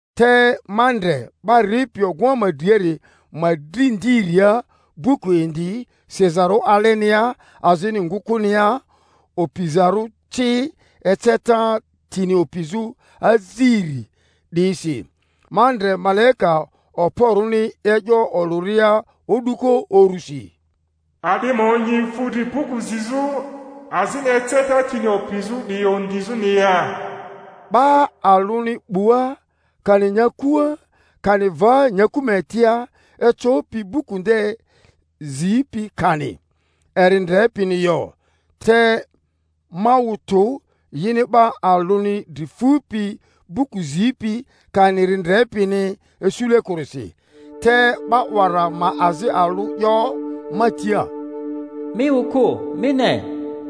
Te ma ndre 'ba ripi ogᴜŋa ma driari ma dri ndiria buku indi sizarᴜ alenia azini ngᴜkᴜnia, opizarᴜ ci eceta tini opizᴜ aziri 'diyisi. Ma ndre malaika okporᴜni e'yo olᴜria o'duko urusi, A'di ma onyi fu dri buku zizᴜ azini eceta tini opizᴜ 'diyi ondizᴜni ya? 'Ba alᴜni 'bua, kani nyakua, kani va nyaku ma etia, ecopi buku nde zipi, kani eri ndrepini yo. Te ma wᴜ tᴜ yini 'ba alᴜni dri fupi buku zipi, kani eri ndrepini isule kᴜrisi. Te 'ba 'wara ma azi alᴜ 'yo ma tia, Mi wᴜ kᴜ; mi ne,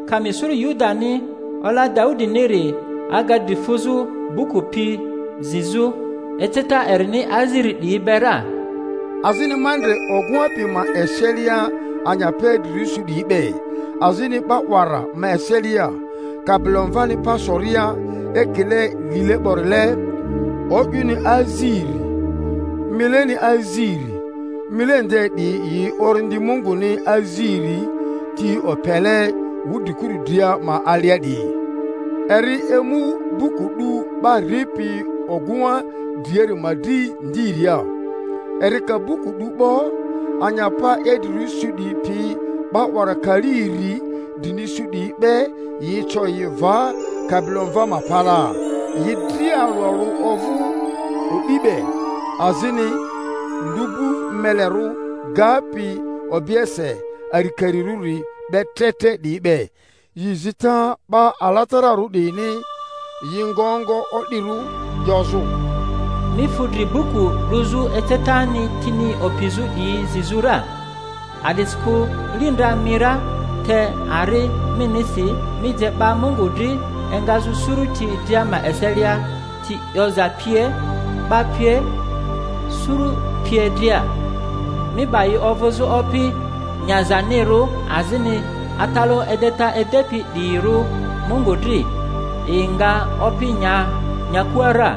Kami suru Yudani, Ola Daudiniri, aga dri fuzᴜ buku pi zizᴜ, eceta erini aziri 'diyi be ra. Azini ma ndre ogᴜŋa pi ma eselia anyapa idrirᴜ su 'diyi be, azini 'ba 'wara ma eselia, Kabilomvani pa soria, ekile lile 'borile, o'yᴜni aziri, mileni aziri, mile nde 'diyi yi Orindi Munguni aziri ti opele wudrikuru dria ma alia 'diyi. Eri emu buku 'du 'ba ripi ogᴜŋa driari ma dri ndiria. Eri ka buku 'du 'bo, anyapa idrirᴜ su 'diyi pi 'ba 'wara kali iri drini su 'diyi be, yi eco yi va Kabilomva ma palaa, yi dria alᴜ alᴜ ovᴜ o'di be, azini lu'bu melerᴜ gapi obiese arikarirᴜri be tre tre 'diyi be, yi zita 'ba alatararᴜ 'diyini. Yi ngo ongo o'dirᴜ, 'yozᴜ, Mi fu dri buku 'duzᴜ, ecetani tini opizᴜ 'diyi zizᴜ ra, a'disikᴜ li ndra mi ra, te ari minisi mi je 'ba Mungu dri engazᴜ suruti dria ma eselia, ti 'yoza pie, 'ba pie, suru pie dria, mi 'ba yi ovᴜzᴜ opi nyazanirᴜ azini atalaᴜ edeta edepi 'diyirᴜ Mungu dri; yi nga opi nya nyakua ra.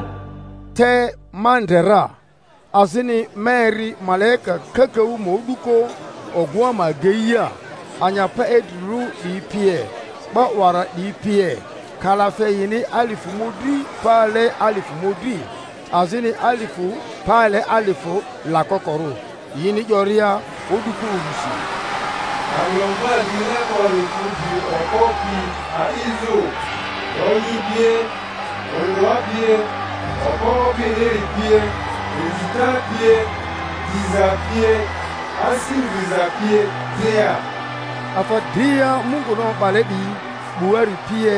Te ma ndre ra, azini ma eri malaika kakaᴜ ma o'duko ogᴜŋa ma ageia, anyapa idrirᴜ 'diyi pie, 'ba 'wara 'diyi pie; kalafe yini alifᴜ mᴜdri pale alifᴜ mᴜdri, azini alifᴜ pale alifᴜ lakokorᴜ; yini 'yoria o'duko urusi, Kabilomva lile 'bori fu dri okpo pi a'izᴜ, lonyi pie, ondᴜa pie, okpo opiniri pie, inzita pie, diza pie, asi ndriza pie dria! Afa dria Munguni o'bale 'diyi 'buari pie,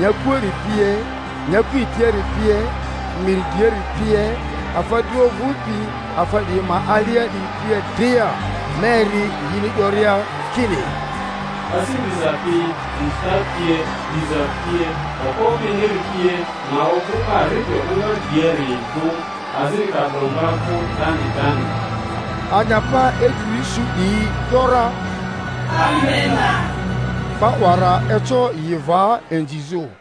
nyakuari pie, nyaku etiari pie, miri driari pie, afa dria ovᴜpi afa 'diyi ma alia 'diyi pie dria, ma eri yini 'yoria kini, Asi ndriza pi, inzita pie, diza pie, okpo opiniri pie ma ovᴜ 'ba ripi ogᴜŋa driari vᴜ, azini Kabilomva vᴜ 'dani 'dani! Anyapa idrirᴜ su 'diyi ‘yora, Amena! 'Ba 'wara eco yi va inzizᴜ.